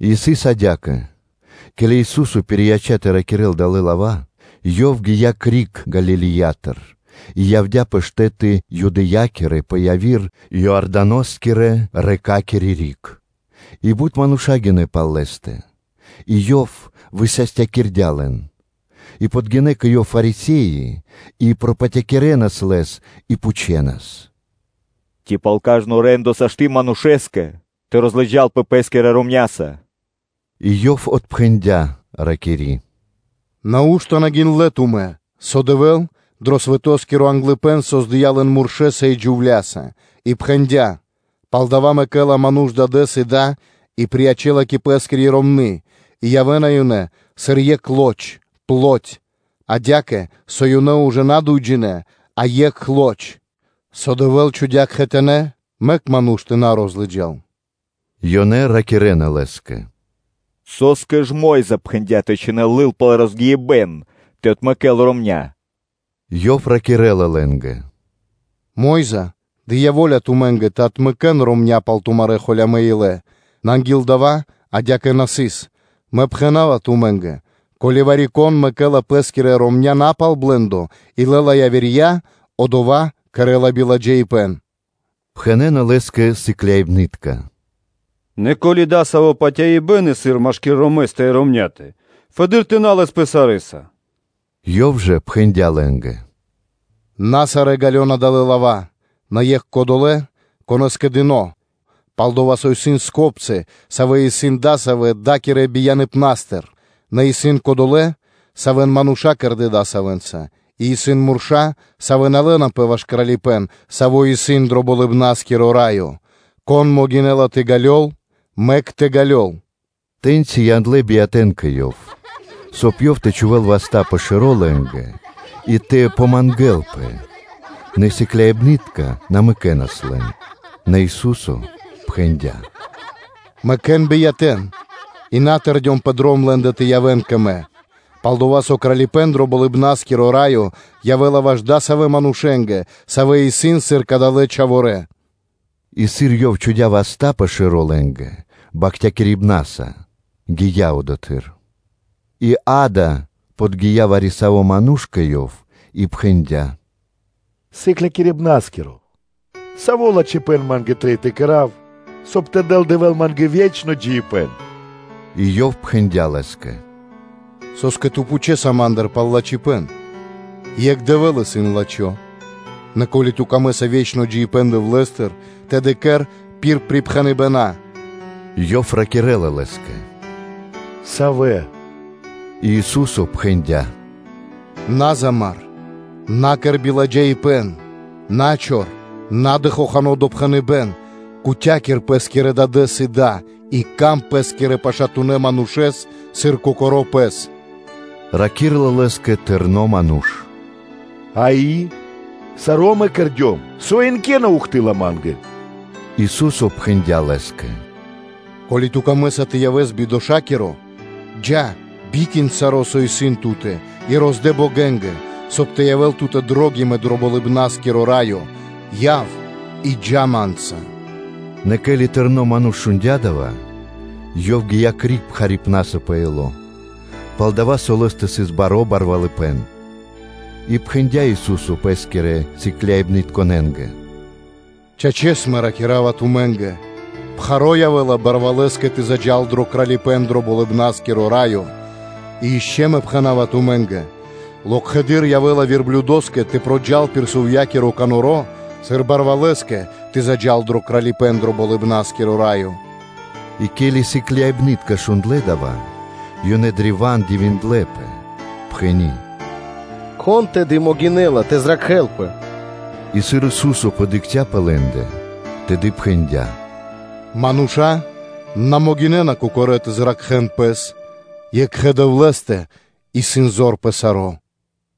И сыс адя́кэ: ке́ли Ису́со пирияця́ тэ ракирэ́л далэ́ лава́, Ёв гия́ криг Галилеятыр и явдя́ пэ штэ́ты Юдэя́кирэ пэ яви́р Иорданоскирэ – рэкакири (лэнякири) риг пэ Иорда́но; и бут мануша́ гинэ́ пал Лэ́стэ, и Ёв высастякирдя́ лэн. И подгинэ́ кэ Ёв Фарисе́и и пропатякирэнас Лэс и пхучэнас: “Ци пал кажно рэ́ндо (де́ло) сашты́ (можна) манушэ́скэ тэ розлыджалпэ пэ́скирэ ромняся? И Ёв отпхэндя́, ракири́: “Нау́што на гиндлэ́ тумэ́, со Дэвэ́л дро англыпэ́н (начало) свэтоскиро создыя́ лэн муршэса и джувля́са? И пхэндя́: ‘Палдава́ мэкэ́ла ману́ш дадэ́с и да и приячэла кэ пэ́скири ромны́, и явэ́на ёнэ сыр екх лоч (плоть); адя́кэ со ёнэ ужэ на дуйджинэ́, а екх лоч? Со Дэвэ́л чхудя́ кхэтанэ́, мэк ману́ш тэ на розлыджал.” Ёнэ ракирэ́на Лэ́скэ: “Со́скэ ж Мо́йза припхэндя́ тэ чхинэл лыл пал розгиибэн тэ отмэкэ́л ромня́.” Ёв ракирэ́ла лэ́нгэ: “Мо́йза дыя́ во́ля тумэ́нгэ тэ отмэкэн ромня́ пал тумарэ́ холямэ́ илэ; нэ анги́л дава́ адя́кэ на сыс. Нэ, Мэ пхэна́ва тумэ́нгэ: ко́ли вари-кон мэкэ́ла пэскирья́ ромня́ на пал блэ́ндо и лэ́ла явирья, одова́ кэрэ́ла биладжаипэ́н.” Пхэнэ́на Лэ́скэ сыкляибны́тка: “Нэ ко́ли дасаво патяибэ́н исын машки́р ромэстэ и ромня́тэ, фэды́р тэ на лэспэ сарэ́са.” Ёв жа пхэндя́ лэ́нгэ: “На сарэ́ ґалёна далэ́ лава́, нэ екх кодолэ́, конэ́скэ дыно́; пал-дова́ со исын скопцы, савэ́ исын дасавэ́ да́кирэ бияныпнастыр; нэ исын кодолэ́, савэ́н мануша́ кэрдэ́ дасавэнца; и исын мурша́, савэ́ на лэнапэ ваш Кралипэ́н, Саво́ исын дро Болыбна́скиро Раё. Кон могинэ́ла тэ ґалёл, мэк тэ ґалёл.” Тэ́ньци яндлэ́ биятэ́н кэ Ёв, соб (кай) Ёв тэ чхувэ́л васта́ пэ шэро́ лэ́нгэ и тэ помангэлпэ; нэ сыкляибны́тка на мэкэнас лэн. Нэ Ису́со пхэндя́: “Мэкэ́н биятэ́н и на тэрдён пэ дром лэ́ндэ тэ явэ́н кэ Мэ; пал-дова́ со Кралипэ́н дро Болыбна́скиро Раё явэ́ла ваш адасавэ́ манушэ́нгэ, савэ́ исын сыр кадалэ́ бияты (чхаворэ́)”, и сыр Ёв чхудя́ васта́ пэ шэро́ лэ́нгэ бахтякирибнаса, то гия́ одотхы́р. И, акэ, подги́я вари-саво́ ману́ш кэ Ёв и пхэндя́: “Сыклякирибна́скиро! Саво́ лачхипэ́н ма́нгэ трэй тэ кэра́в, соб (кай) тэ дэл Дэвэ́л ма́нгэ ве́чно джиибэ́н?” И Ёв пхэндя́ лэ́скэ: “Со́скэ ту пхучэса Ма́ндыр пал лачхипэ́н? Екх Дэвэ́л исын лачхо́. Нэ ко́ли ту́кэ исын дро́го ве́чно джиибэ́н Дэвлэ́стыр, тэды кэр пир припхэныбэна́.” Ёв ракирэ́ла Лэ́скэ: “Савэ?” И Ису́со пхэндя́: “На замар (на умар), на кэр биладжаипэ́н, на чор, на дэ хохано́ допхэныбэ́н, кутякир пэ́скирэ дадэ́с и да; и сыка́в паты́в пэ́скирэ пашатунэ́ манушэ́скэ, сыр кокоро́ пэ́скэ.” Раки́рла Лэ́скэ тырно ману́ш: “Дава́ саро́ мэ кэрдём; со ишчо (инкэ́) на ухты́лла (на́доси) ма́нгэ?” Ису́со пхэндя́ лэ́скэ: “Ко́ли ту́кэ исын пир ило́ тэ явэс бидошакиро, джа́, бикин саро́, со исын ту́тэ, и роздэ богэнгэ, соб (кай) тэ явэ́л ту́тэ кучипэ́н дро Болыбна́скиро Раё; яв’ и джа́ Ма́нца.” Нэ ке́ли тырно ману́ш шундя́ дава́, ёв гия́ криг пхарипнаса пэ ило́, пал-дова́ со лэ́стэ сыс баро́ барвалыпэ́н. И пхэндя́ Ису́со Пэ́скирэ сыкляибнытконэ́нгэ: “Чачэс, Мэ ракира́ва тумэ́нгэ: пхаро́ явэ́ла барвалэскэ тэ заджа́л дро Кралипэ́н дро Болыбна́скиро Раё; и ишчо (инкэ́) Мэ пхэна́ва тумэ́нгэ: локхэды́р явэ́ла верблюдоскэ тэ проджал пир сувьякиро каноро, сыр барвалэскэ тэ заджа́л дро Кралипэ́н дро Болыбна́скиро Раё.” И ке́ли сыкляибны́тка шундлэ́ дава́, ёнэ древа́н дивиндлэ́пэ, пхэни́: “Кон тэды могинэ́ла тэ зракхэлпэ?” И сыр Ису́со подыкхця́ пэ лэ́ндэ, тэды пхэндя́: “Мануша́ на могинэ́на кокорэ́ тэ зракхэн пэс; екхэ Дэвлэ́стэ исын зор пэ саро́.”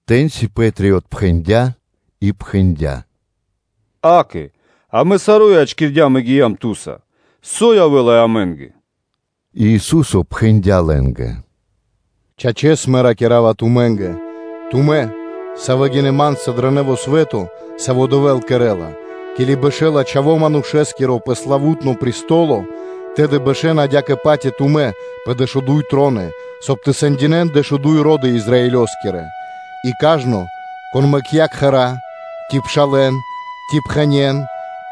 Тэ́ньци Пэ́три отпхэндя́ и пхэндя́: “Гада, амэ саро́ ячкирдям и гиям Ту́са, со явэ́ла амэ́нгэ?” И Ису́со пхэндя́ лэ́нгэ: “Чачэс, Мэ ракира́ва тумэ́нгэ: тумэ́, савэ́ гинэ́ Ма́нца дро нэво́ свэ́то, саво́ Дэвэ́л кэрэ́ла, ке́ли бэшэ́ла Чхаво́ Манушэ́скиро пэ славу́тно престоло, тэды бэшэна адя́кэ-паць и тумэ́ пэ дэшуду́й троны, соб (кай) тэ сэндинэ́н дэшуду́й ро́ды Израилёскирэ. И кажно, кон мэкця́ кхэра́ ци пшалэ́н, ци пхэнен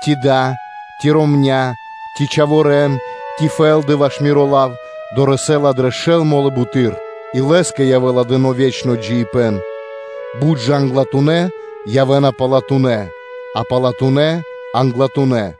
ци да, ци ромня́, ци чхаворэ́н, ци фэ́лды ваш Миро лав, дорэсэ́ла дрэ шэл мо́лы буты́р и лэ́скэ явэ́ла дыно́ ве́чно джиибэ́н. Бут жа англатунэ́ явэ́на палатунэ́, а палатунэ́ явэ́на англатунэ́.